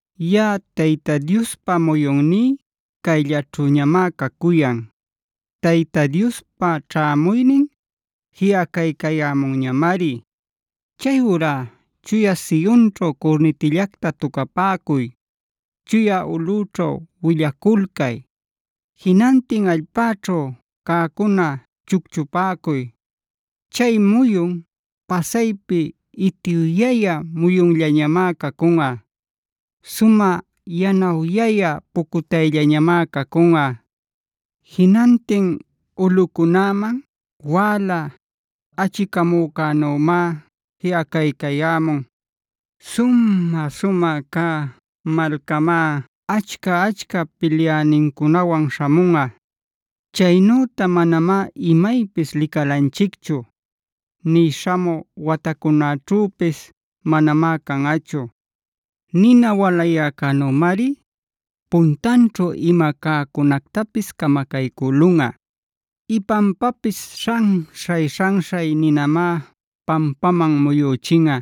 “Yaꞌa Tayta Diospa muyunní cayllaćhüñamá cacuyan. Tayta Diospa ćhämuynin jiꞌacaycayämunñamari. Chayurá chuya Sionćhu curnitillacta tucapäcuy; chuya ulꞌüćhu willaculcay. Jinantin allpäćhu cäcuna chucchupäcuy. Chay muyun pasaypi itiwyayä muyunllañamá cacunꞌa. Sumä yanawyayä pucutayllañamá cacunꞌa. Jinantin ulꞌucunäman wäla achicamücänümá jiꞌacaycayämun. Sumä-sumä cä malcamá achca-achca pilyänincunawan śhamunꞌa. Chaynüta manamá imaypis licalanchicchu; nï śhamü watacunäćhüpis manamá canꞌachu. “Nina walayäcänümari puntanćhu ima cäcunactapis camacaycülunꞌa. Ipanpapis śhanśhay-śhanśhay ninamá pampaman muyüchinꞌa.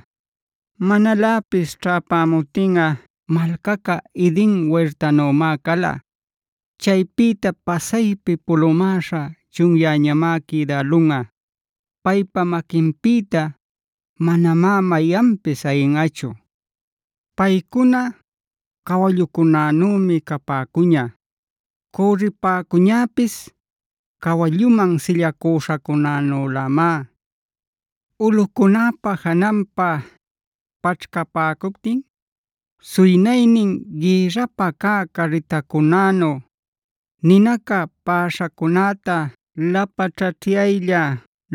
Manaläpis ćhäpämuptinꞌa malcaca Eden wirtanümá cala. Chaypïtá pasaypi pulumäśha chunyäñamá quïdälunꞌa. Paypa maquinpïta manamá mayanpis ayinꞌachu. Paycuna cawallucunänümi capäcuña. Cürripäcuñäpis cawalluman sillacüśhacunänülämá. Ulꞌucunäpa jananpa paćhcapäcuptin suynaynin gïrrapä cä carritacunänu, ninaca paꞌaśhacunäta lapaćhaćhyaylla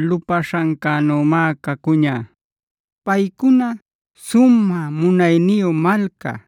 lupaśhancänümá cacuña. Paycuna sumä munayniyu malca,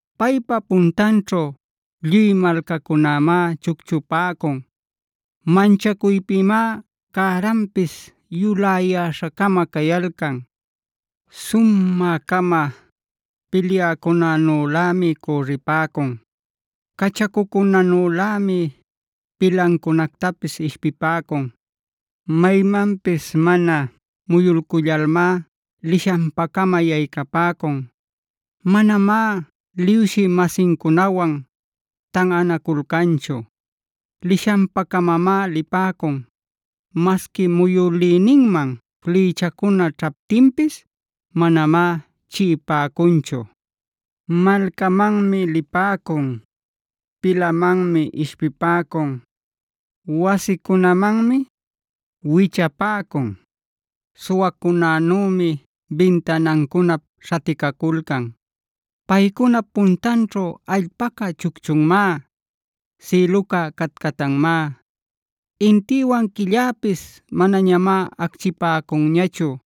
Paypa puntanćhu lluy malcacunämá chucchupäcun; manchacuypïmá cäranpis yuläyäśha-cama cayalcan. Sumä-cama pilyäcunänülämi cürripäcun; cachacucunänülämi pilancunactapis ishpipäcun. Maymanpis mana muyulcullalmá lishanpa-cama yaycapäcun. Manamá liwshï-masincunawan tanꞌanaculcanchu; lishanpa-camamá lipäcun. Masqui muyülïninman flïchacuna ćhaptinpis manamá chiꞌipäcunchu. Malcamanmi lipäcun, pilamanmi ishpipäcun, wasicunämanmi wichapäcun, suwacunänümi bintanancunap śhaticaculcan. “Paycunap puntanćhu allpaca chucchunmá; sïluca catcatanmá. Intïwan quilläpis manañamá acchipäcunñachu;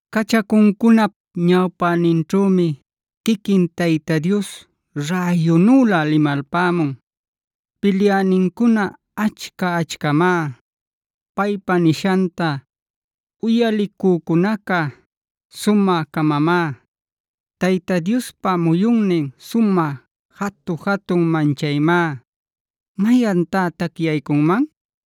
Cachacuncunap ñawpäninćhümi quiquin Tayta Dios räyunülä limalpämun. Pilyänincuna achca-achcamá; paypa nishanta uyalicücunaca sumä-camamá. Tayta Diospa muyunnin sumä jatu-jatun manchaymá. ¿Mayantá tacyaycunman?”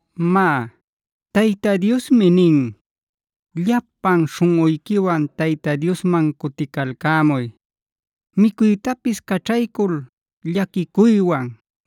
Má, Tayta Diosmi nin: “Llapan śhunꞌuyquiwan Tayta Diosman cuticalcämuy. Micuytapis caćhaycul llaquicuywan,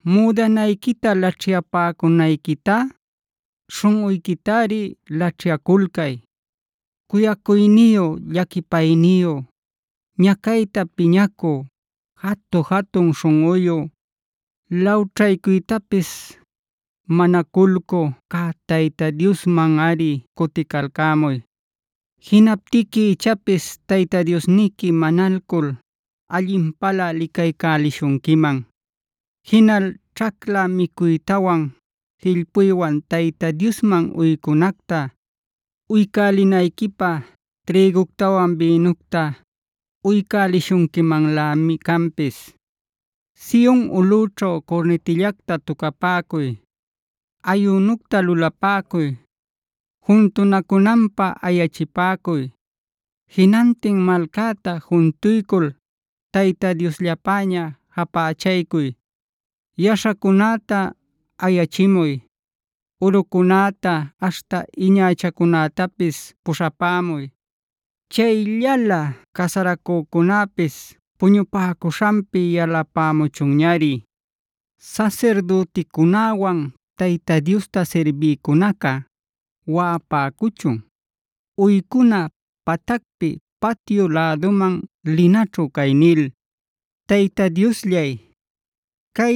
Müdanayquita laćhyapäcunayquitá śhunꞌuyquitari laćhyaculcay. Cuyacuyniyu, llaquipayniyu,e ñacayta piñacü, jatu-jatun śhunꞌuyu, lawćhaycuytapis manaculcü cä Tayta Diosmanꞌari cuticalcämuy. Jinaptiqui ichapis Tayta Diosniqui manalcul allinpalä licaycuśhunquiman. Jinal ćhacla micuytawan jillpuywan Tayta Diosman uycunacta uycälinayquipä trïguctawan bïnucta uycälishunquimanlämi canpis. “¡Sion ulꞌućhu curnitillacta tucapäcuy! ¡Ayünucta lulapäcuy! ¡Juntunacunanpä ayachipäcuy! Jinantin malcäta juntuycul Tayta Diosllapäña japächaycuy. Yaśhacunäta ayachimuy; urucunäta aśhta iñachacunätapis puśhapämuy. Chayllalä casaracücunäpis puñupäcuśhanpi yalapämuchunñari. Sasirdüticunäwan Tayta Diosta sirbïcunaca waꞌapäcuchun, uycuna patacpi patyu läduman linaćhu cay nil: ‘Tayta Diosllay, cay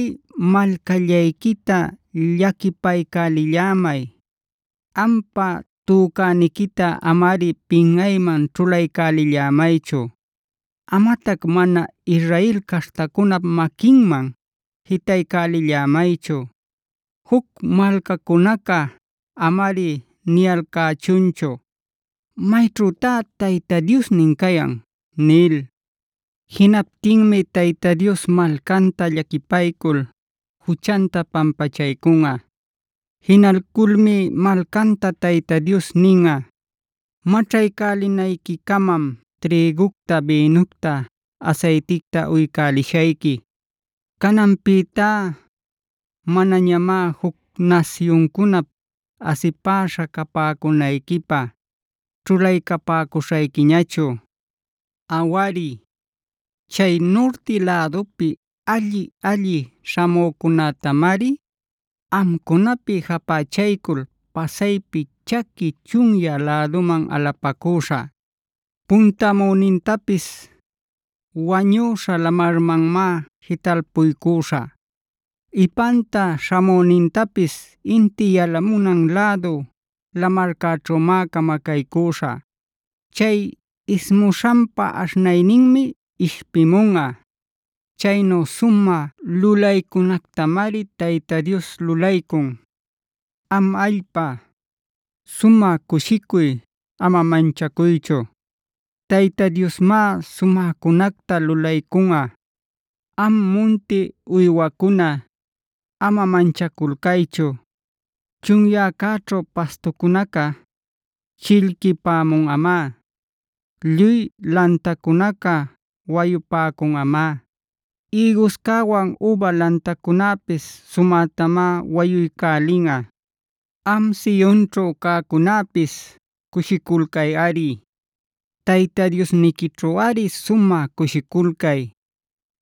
malcallayquita llaquipaycälillämay. Ampa tücäniquita amari pinꞌayman ćhulaycälillämaychu; amatac mana Israel caśhtacunap maquinman jitaycälillämaychu. Juc malcacunaca amari niyalcächunchu ¿Mayćhütá Tayta Diosnin cayan?’” Jinaptinmi Tayta Dios malcanta llaquipaycul juchanta pampachaycunꞌa. Jinalculmi malcanta Tayta Dios ninꞌa: “Maćhaycälinayquicamam trïgucta, bïnucta, asayticta uycälishayqui. Cananpïtá manañamá juc nasyuncunap asipäśha capäcunayquipä ćhulaycapäcuśhayquiñachu. “Awari, chay nurti lädupi alli-alli śhamücunätamari amcunapi japächalcul pasaypi chaqui chunyä läduman alapacüśhä. Puntamünintapis Wañüśha Lamarmanmá jitalpuycüśhä; ipanpa śhamünintapis inti yalamunan lädu lamarcäćhümá camacaycüśhä. Chay ismuśhanpa aśhnayninmi ishpimunꞌa. Chaynu sumä lulaycunactamari Tayta Dios lulaycun. “Am allpa, sumä cushicuy; ama manchacuychu. Tayta Diosmá sumäcunacta lulaycunꞌa. Am munti uywacuna, ama manchaculcaychu. Chunyäcäćhu pastucunaca chillquipämunꞌamá. Lluy lantacunaca wayupäcunꞌamá; ïguscäwan üba lantacunäpis sumätamá wayuycälinꞌa. Am Sionćhu cäcunäpis cushiculcayꞌari; Tayta Diosniquićhuꞌari sumä cushiculcay.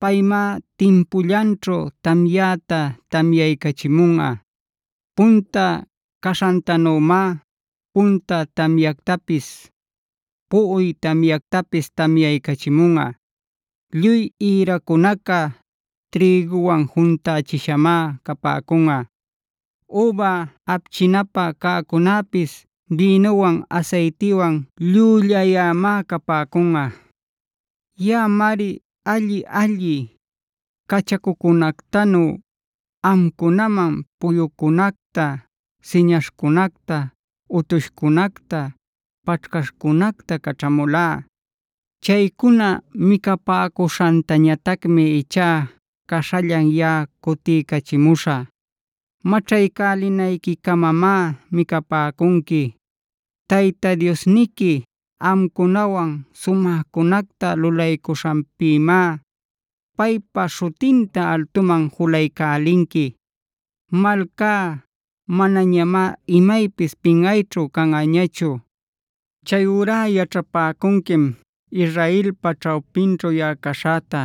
Paymá timpullanćhu tamyäta tamyaycachimunꞌa. Punta caśhantanümá punta tamyactapis, puꞌuy tamyactapis tamyaycachimunꞌa. Lluy ïracunaca trïguwan juntächishamá capäcunꞌa. Üba apchinapä cäcunäpis bïnuwan asaytiwan llüllayämá capäcunꞌa. “Yaꞌamari alli-alli cachacucunactanu amcunaman puyucunacta, siñaśhcunacta, utushcunacta, paćhcaśhcunacta caćhamulá. Chaycuna micapäcuśhantañatacmi ichá caśhallan yaꞌa cutiycachimuśhä. Maćhaycälinayquicamamá micapäcunqui. Tayta Diosniqui amcunawan sumäcunacta lulaycuśhanpïmá paypa śhutinta altuman julaycälinqui. Malcá manañamá imaypis pinꞌayćhu canꞌañachu. Chayurá yaćhapäcunquim Israelpa ćhawpinćhu yaꞌa caśhäta;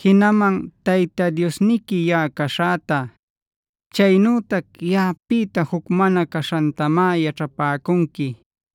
jinaman Tayta Diosniqui yaꞌa caśhäta; chaynütac yaꞌapïta juc mana caśhantamá yaćhapäcunqui.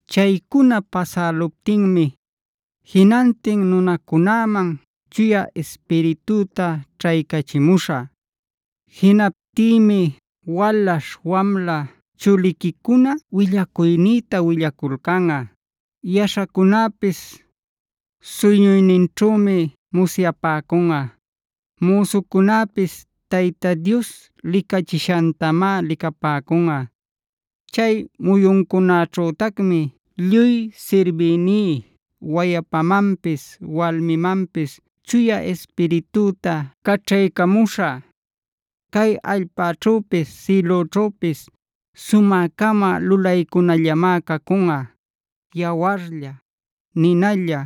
“Chaycuna pasäluptinmi jinantin nunacunäman Chuya Ispiritüta ćhaycachimuśhä.h Jinaptïmi walaśh wamla chuliquicuna willacuynïta willaculcanꞌa. Yaśhacunäpis suyñuyninćhümi musyapäcunꞌa. Müsucunäpis Tayta Dios licachishantamá licapäcunꞌa. Chay muyuncunaćhütacmi lluy sirbïní wayapamanpis walmimanpis Chuya Ispiritüta caćhaycamuśhä. Cay allpäćhüpis sïlüćhüpis sumä-cama lulaycunallamá cacunꞌa; yawarlla, ninalla,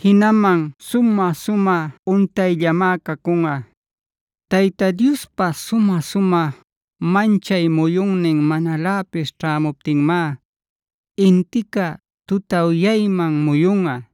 jinaman sumä-sumä untayllamá cacunꞌa. Tayta Diospa sumä-sumä manchay muyunnin manaläpis ćhämuptinmá intica tutawyayman muyunꞌa;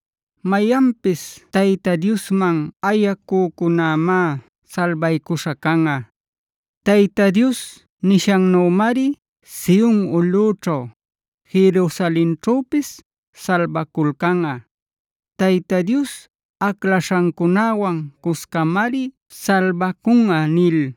Mayanpis Tayta Diosman ayacücunämá salbaycuśha canꞌa.j Tayta Dios nishannümari Sion ulꞌućhu, Jerusalenćhüpis salbaculcanꞌa. Tayta Dios aclaśhancunäwan cuscamari salbacunꞌa” nil.